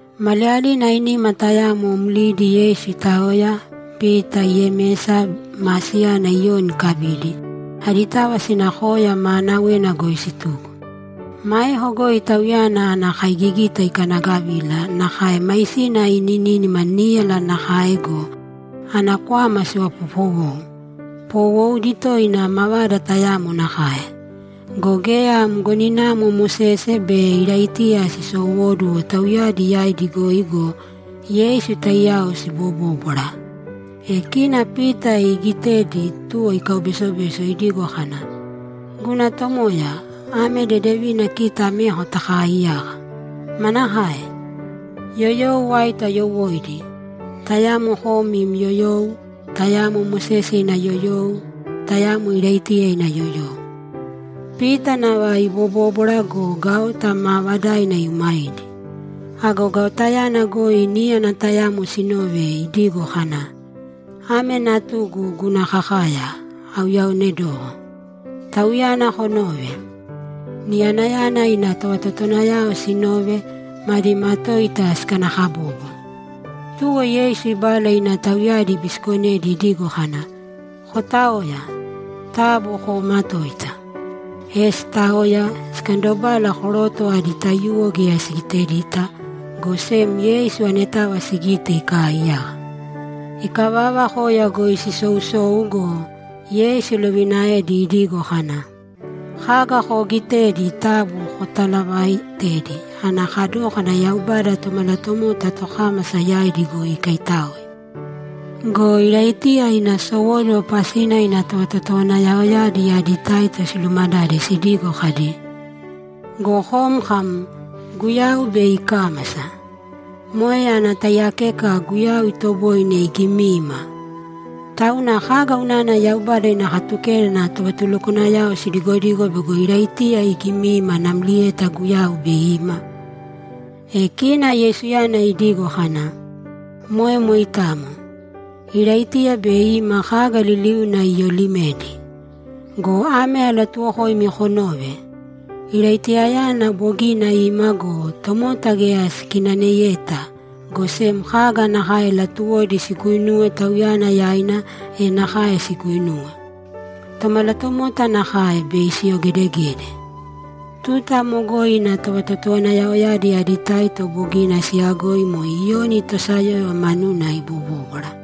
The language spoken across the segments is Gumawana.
Maliyalina ainima tayamo mlidi Yeisu itaoya, Pita, Yemesa ma siyana Iyoni ikabidi, aditava sina koya maanawena goi situko. Maeko goi Tauyana ana kaigigita ikanagavila, nakae maisina inínima níyala nakae go, ana kwama sivapopowou, poowoudi toina mavada tayamo nakae. Go geya mgoninamo Mosese be Iraitiya sisowóduwo tauyadi yaidi goi go, Yeisu taiyao sibobóbwara. E kina Pita iigitedi, tuwo ikaubesobeso idigo kana, ‘Guna Tomoya, ame dedevina kita ameko takaaiyaka. Manakae? Yoyou aito ayowóidi? Tayamo kom im yoyou, tayamo Mosese ina yoyou, tayamo Iraitiya ina yoyou.’ Pita nava ibobóbwara go, gaota maavadaina iumaidi. Ago gaotayana goi níyana tayamo sinove idigo kana, ‘Ame Natugu, guna kakaya, auyaonedoko. Tauyana konōve!’ Niyanayana ina tovatotowanayao sinove, madi matoita sikanakabobo. Tuwo Yeisu ibala ina tauyadi ibisikonedi idigo kana, ‘Kotāoya. Taabu koomatōita.’ E sitaoya, sikandobala, koroto adi taiyuwo geya sigitedita, go sem Yeisu anetava sigite ikaaiyaka. Ikavava, koya goi sisousou go, Yeisu ilovinaedi idigo kana, ‘Kaga koogitedi taabu kotalaavaitēdi ana kadókana Yaubada Tomalatomota tokámasa yaidi goi ikaitáoe.’ Go Iraitiya ina sowóduwo pasina ina tovatotowanayaoyadi adi taito silumadade sidigo kadi, ‘Go kom kam, “Guyau bei ikámasa.” Moe ana taiyakeka Guyau itoboine igimiima. Tauna kaga unana Yaubada ina Katukeda ana tovatulukwanayao sidigodigo bego Iraitiya igimiima namlieta Guyau bei ima?’ E kina Yeisuyana idigo kana, ‘Moe moitamo. Iraitiya bei ima kaga liliuna iyolimedi. Go ame alatuuwokoimi konōve: Iraitiyayana bogina ima go, tomota geya sikinaneyeta, go sem kaga nakae latuwodi siguinuwe tauyana yaina, e nakae siguinuwe. Tomalatomota nakae, bei siyogedegede.’ Tuta amo goi ina tovatotowanayaoyadi adi taito bogina siyagoi moe Iyoni tosayóyova manuna ibobóbwara.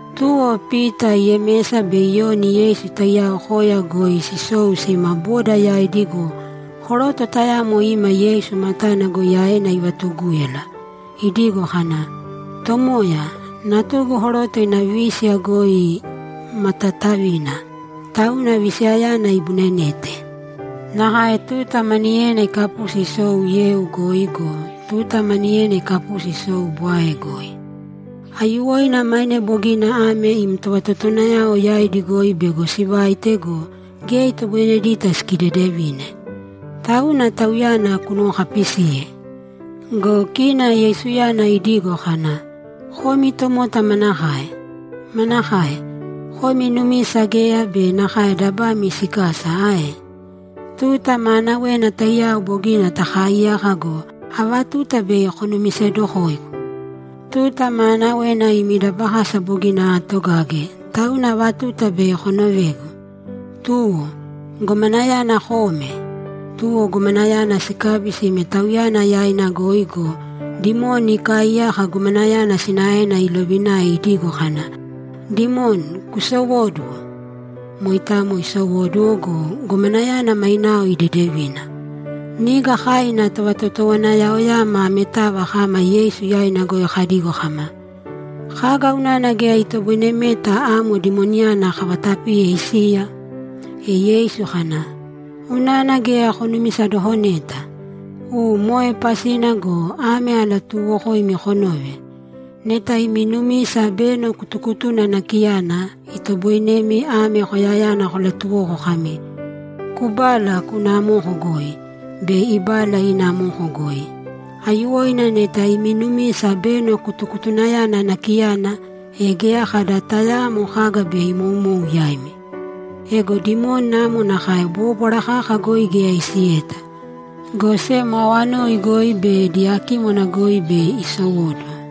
Tuwo Pita, Yemesa be Iyoni Yeisu taiyao koya goi sisou sima boda yaidi go, koroto tayamo ima Yeisu matana goi aena ivatugúyala idigo kana, ‘Tomoya, natugu koroto ina vísiya goi ma taatavina, tauna visiyayana ibunenete. Nakae tuta maniyena ikapusi isou yeu goi go, tuta maniyena ikapusi isou bwae goi. Aiyuwoina maine bogina ame im tovatotowanayao yaidi goi bego sivaite go, geya itoboinedita sikidedevine. Tauna tauyana kunuwokapisīye.’ Go kina Yeisuyana idigo kana, ‘Komi tomota manakae? Manakae? Komi numisa geya be nakae dabami sikasa ae? Tuta maanawena taiyao bogina takaaiyaka go, ava tuta bei konumisedokoigu? Tuta maanawena imi dabakasa bogina aatogage, tauna ava tuta bei konovegu? Tuwo, gomanayana kōme!’ Tuwo gomanayana sikabi sime Tauyana yaina goi go, dimoni ikaaiyaka gomanayana sinaena ilovinae idigo kana, ‘Dimoni, kusowōduwo!’ Moitamo isowóduwo go, gomanayana mainao idedevina. Niga kai ina tovatotowanayaoyama ametava kama Yeisu yaina goi kadigo kama, ‘Kaga unana geya itoboinemeta amo dimoniyana kavatapiye isiya?’ E Yeisu kana, ‘Unana geya konumisadokoneta. U, moe pasina go, ame alatuuwokoimi konōve: Neta imi numisa beno kutukutuna nakiyana, itoboinemi ame koyayana kolatuwoko kami, “Kubāla kūna amoko goi”, bei ibala ina amoko goi. Aiyuwoina neta imi numisa beno kutukutunayana nakiyana, e geya kada tayaamo kaga bei imoumou yaimi. [ Ego dimoni amo nakae bóbwara kaka goi geya isiyeta, go sem awanoi goi be diyakímwana goi bei isowóduwo.]’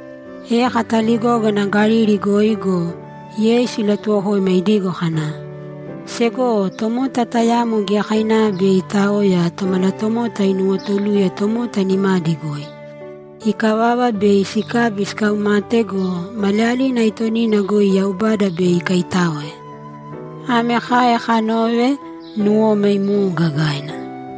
E kataligógana Galili goi go, Yeisu ilatuwokoima idigo kana, ‘Segowo, tomota tayamo giyakainava bei itaoya, Tomalatomota inuwotuluye tomota nimadi goi. Ikavava, bei sikabi sikaumate go, maliyalina aitonina goi Yaubada bei ikaitáoe.’ Ame kai kanove, nuwoma imou gagaina.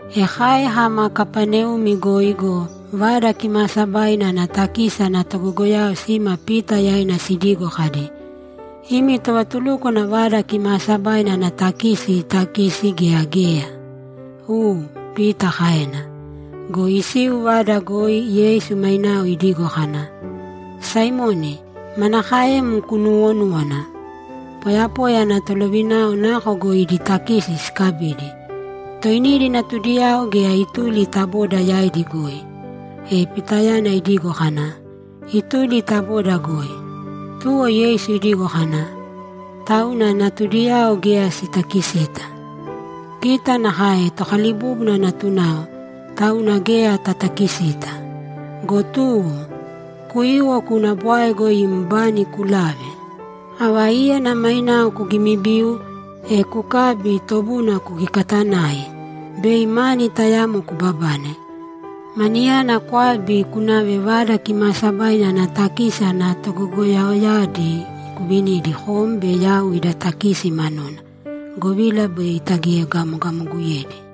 E kai kama Kapaneumi goi go, Vada Kimaasabaina ana takisi ana togogoyao sima Pita yaina sidigo kadi, ‘Imi tovatulúkwana Vada Kimaasabaina ana takisi itakisi gea geya?’ ‘U’, Pita kaena. Go isiu vada goi, Yeisu mainao idigo kana, ‘Saimoni, manakaem kunuwonúwana? Poyapoya ana tolovinao nako goi idi takisi sikabidi, toinidi natudiyao gea ituli ta boda yaidi goi?’ E Pitayana idigo kana, ‘Ituli ta boda goi.’ Tuwo Yeisu idigo kana, ‘Tauna natudiyao geya sitakisita. Kita nakae tokalibúbuna natunao, tauna geya tatakisita. Go tuwo, kuīwo kūna bwae goi im bani kulāve. Ava íyana mainao kugimibiu, e kukābi, tobuna kukikatanāi, bei mani tayamo kubabane. Maniyana kwābi kunāve Vada Kimaasabaina ana takisi ana togogoyaoyadi kuvinīdi kom be yau ida takisi manuna, govila bei tagiegamogamoguyedi.’